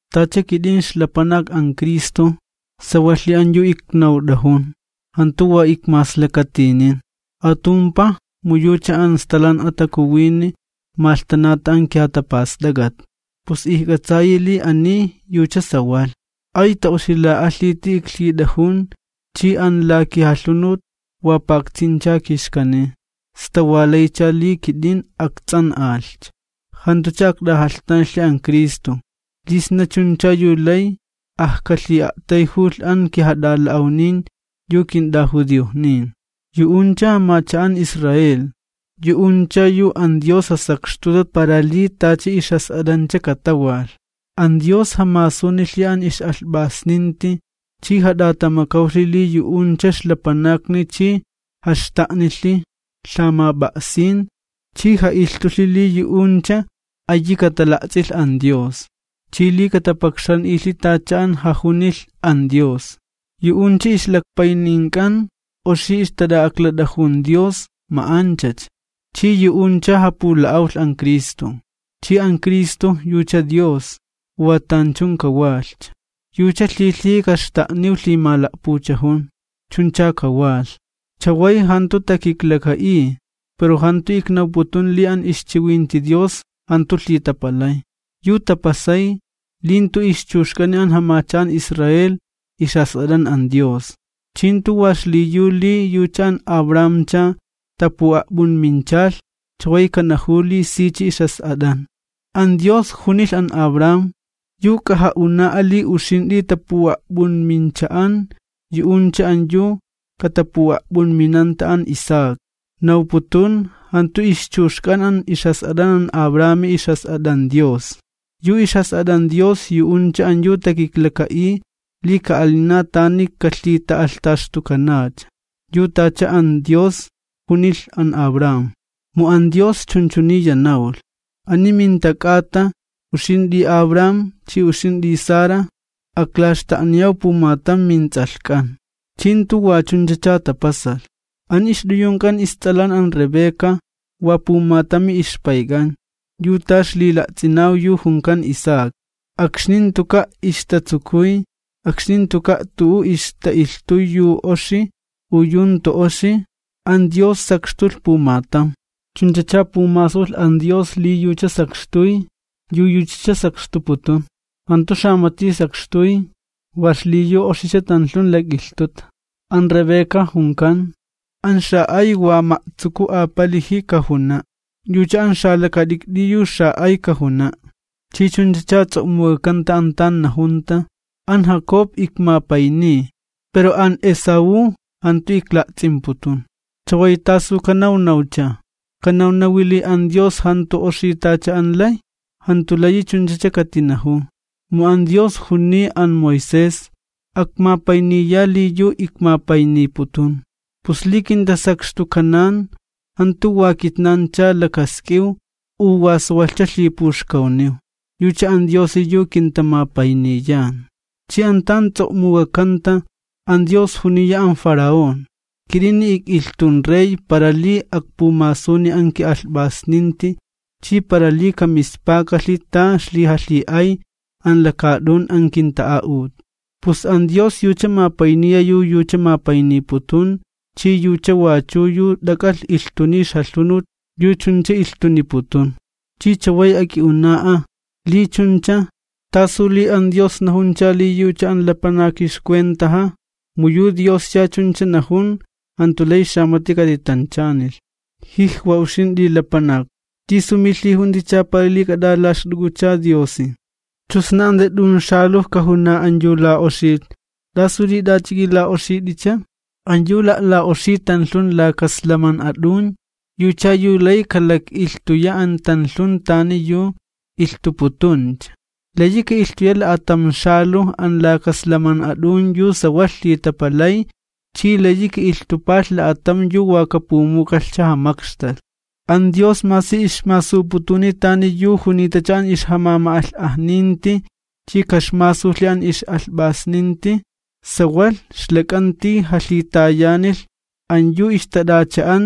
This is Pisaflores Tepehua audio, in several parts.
Tacha kit'in ixlapanak an Cristo, sawalhi an yu iknawt'ajun, jantu wa ikmaslakatinin. Atumpaj mu yucha an Stalan'a Takuwini malhtanata an kijatapast'ak'at, pus ijk'atsayi li ani yucha sawalh. Ay ta'oxila'alhiti iklhit'ajun chi an la kijalhunut wa paktsincha kixkaniy, sta wa laycha li kit'in akts'an'alhcha, jantucha akt'ajalhtanalhi an Cristo, li sna chuncha yu lay akjalhi'a'tayjulh an kijat'ala'awnin, yu kint'ajudiojnin. Yu'uncha jamacha'an Israel, yu'uncha yu an Dios jasakxtuta para li tacha ixjas'at'ancha katawalh. An Dios jamasunilhi an ix'alhp'asninti chi jat'atamakawlhi li yu'uncha ixlapanakni chi jaxta'nilhi lhamap'a'sin chi ja'ilhtulhi li yu'uncha ayi katala'ts'ilh an Dios, chi li katapakxan'ilhi tacha an jajunilh an Dios. Yu'uncha ixlakpaynink'an oxi ixtat'a'aklat'ajun Dios ma'anchacha. Chi yu'uncha japula'awlh an Cristo, chi an Cristo yucha Dios, wa tanchun kawalhcha. Yucha lhilhiji kaxta'niw lhimala'puchajun. Chuncha kajunlhi. Chaway jantu takiklaka'iy pero jantu iknawputun li an ixchiwinti Dios jantu lhitapalay. Yu tapasay, li jantu ixchuxk'ani an jamacha'an Israel ixjas'at'an an Dios. Chi jantu wa xliyu li yucha an Abrahamcha tapu'a'p'unminchalh, chaway kanajuw li sicha ixjas'at'an. An Dios junilh an Abraham: “Yu k'aja'una'a li uxint'i tapu'a'p'unmincha'an yu'uncha an yu katapu'a'p'unminanta an Isaac.” Nawputun, jantu ixchuxk'an an ixjas'at'an an Abrahami ixjas'at'an Dios, yu ixjas'at'an Dios yu'uncha an yu takiklaka'iy li ka'alina tani kalhita'alhtaxtukanacha, yu tacha an Dios junilh an Abraham. Mu an Dios chunchuniya nawlh: “Ani minta k'ata, uxint'i Abraham chi uxint'i Sara, aklaxta'niyaw pumatam mints'alhk'an.” Chi jantu wa chunchacha tapasalh. An ixt'uyunk'an ists'alan an Rebeca wa pumatami ixpayk'an, yu ta ixlila'ts'inaw yu junkan Isaac. Akxni jantuka' ixtatsukuy, akxni jantuka' tu'u ixta'ilhtuy yu oxi u yu jantu oxi, an Dios sakxtulh pumatam. Chunchacha pumasulh an Dios li yucha sakxtuy yu yuchacha sakxtuputun, jantu xamati sakxtuy wa xliyu oxicha tanlhun lak'ilhtuta, an Rebeca junkan: “An xa'ay wa ma'tsuku apaliji kajuna', yucha an xalakat'ikt'i yu xa'ay kajuna'.” Chi chuncha ts'o'muk'akanta an tan najunta: “An Jacob ikmapayniy, pero an Esaú jantu ikla'ts'imputun.” ¿Chaway tasu kanawnawcha? ¿Kanawnawi li an Dios jantu oxi tacha an lay? Jantu layi chunchacha katinajuw. Mu an Dios juniy an Moisés: “Akmapayniya li yu ikmapayniputun.” Pus li kintasakxtukanan, jantu wa kitnancha lakask'iw u wa sawalhcha lhipuxkawniw, yucha an Diosi yu kintamapayniyan. Chi an tan ts'o'muk'akanta, an Dios juniya an Faraón: “Kit'ini ik'ilhtun rej para li akpumasun an ki'alhp'asninti chi para li kamispakalhi ta ixlijalhi'ay an lakaat'un an kinta'a'ut.” Pus an Dios yucha mapayniya yu yucha mapayniputun, chi yucha wachu yu t'ak'alh ilhtuniy ixjalhunut yu chuncha ilhtuniputun. Chi chaway ak'i'una'a: “Li chuncha, ¿tasu li an Dios najuncha li yucha an lapanaki ixcuentaja, mu yu Dioscha chuncha najun jantu lay xamati katitanchanilhi?” ¡Uxint'i lapanak! ¿Tisu milhijunticha para li k'at'alaxt'uk'ucha Diosi? Chu sna an yu wa t'un xaluj kajuna an yu la'oxilh: “¿Tasu li t'ach'a k'ila'oxit'icha?” An yu la'la'oxiy tanlhun laka slaman'a t'un yucha yu lay kalak'ilhtuya an tanlhun tani yu ilhtuputuncha. Layi ka'ilhtulh la'atam xaluj an laka slaman'a t'un yu sawalh lhitapalay chi layi ka'ilhtupalh la'atam yu wa kapumukalhcha jamakxtalh. An Dios masi ixmasuputuni tani yu junitacha an ixjamama'alh'ajninti chi kaxmasulhi an ix'alhp'asninti, sawalh ixlak'anti jalhitayanilh an yu ixtat'acha'an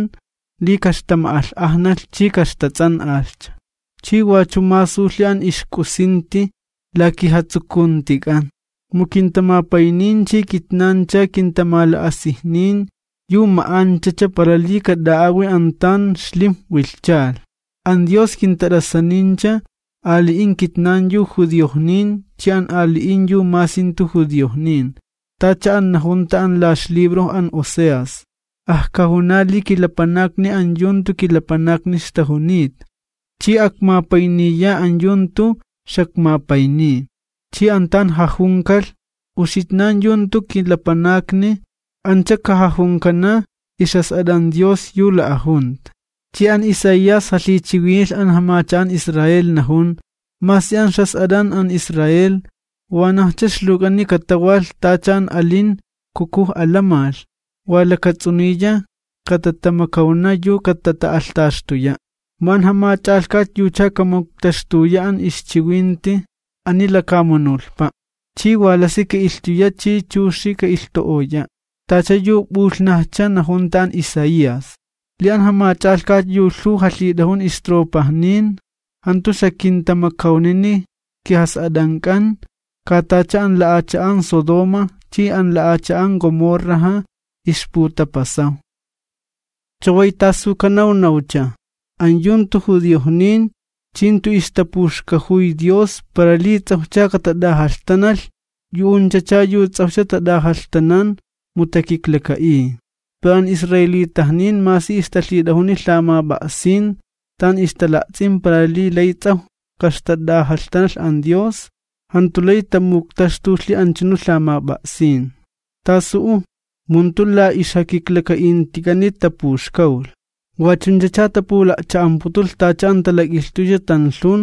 li kaxtama'alh'ajnalh chi kaxtats'an'alhcha. Chi wachu masulhi an ixk'usinti la kijatsukuntik'an, mu kintamapaynin chi kitnancha kintamala'asijnin yu ma'anchacha para li kat'a'awi an tan xlimj wilhchalh. An Dios kintat'asanincha, ali'in kitnan yu judiojnin chi an ali'in yu masi jantu judiojnin. Tacha an najunta an la ixlibro an Oseas: Ajkajuna li kilapanakni an yu jantu kilapanakni ixtajunita. Chi akmapayniya an yu jantu xakmapayniy. Chi an tan jajunikalh: “Uxitnan jantu kilapanakni”, ancha kajajunkana ixjas'at'an Dios yu la'ajunta. Chi an Isaías jalhichiwinilh an jamacha'an Israel, najun: Masi an ixjas'at'an an Israel wanajcha ixluwk'ani katawalh tacha an alin kukuj alamalh, wa lakats'uniya katatamakawna yu katata'alhtaxtuya'. Mu an Jamach'alhkat yucha kamuktaxtuya an ixchiwinti ani lakamunulhpa', chi wa lasi ka'ilhtuya chi chuxi ka'ilhtu'oya'. Tacha yu p'ulhnajcha najunta an Isaías: Li an Jamach'alhkat yu lhuw jalhit'ajun isoldadojnin jantu xakintamakawnini kijas'at'ank'an, ka tacha an la'acha'an Sodoma chi an la'acha'an Gomorraja ixputapasaw. ¿Chaway tasu kanawnawcha? An yu jantu judiojnin chi jantu ixtapuxkajuy Dios para li ts'awjcha katat'ajalhtanalh, yu'unchacha yu ts'awjcha tat'ajalhtanan mu takiklaka'iy. Pero an israelitajnin masi ixtalhit'ajuni lhamap'a'sin tan ixtala'ts'in para li lay ts'awj kaxtat'ajalhtanalh an Dios, jantu lay tamuktaxtulhi anchunu lhamap'a'sin. ¿Tasu'u? Mu jantu la ixjakiklaka'intik'ani tapuxkawlh, wachunchacha tapula'cha'amputulh tacha an talak'ilhtuycha tanlhun,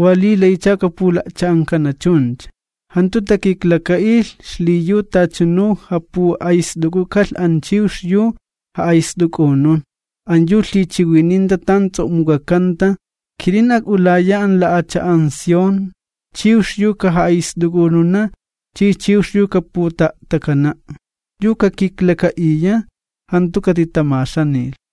wa li laycha kapula'cha'ankana chuncha. Jantu takiklaka'ilh xliyu tachanu japu'ayst'uk'ukalh an chiwx yu ja'ayst'uk'unun, an yu lhichiwininta tan ts'o'muk'akanta: Kit'in ak'ulaya an la'acha'an Sión, chiwx yu kaja'ayst'uk'ununa chi chiwx yu kaputa'a'takana'. Yu kakiklaka'iya jantu katitamaxanilh.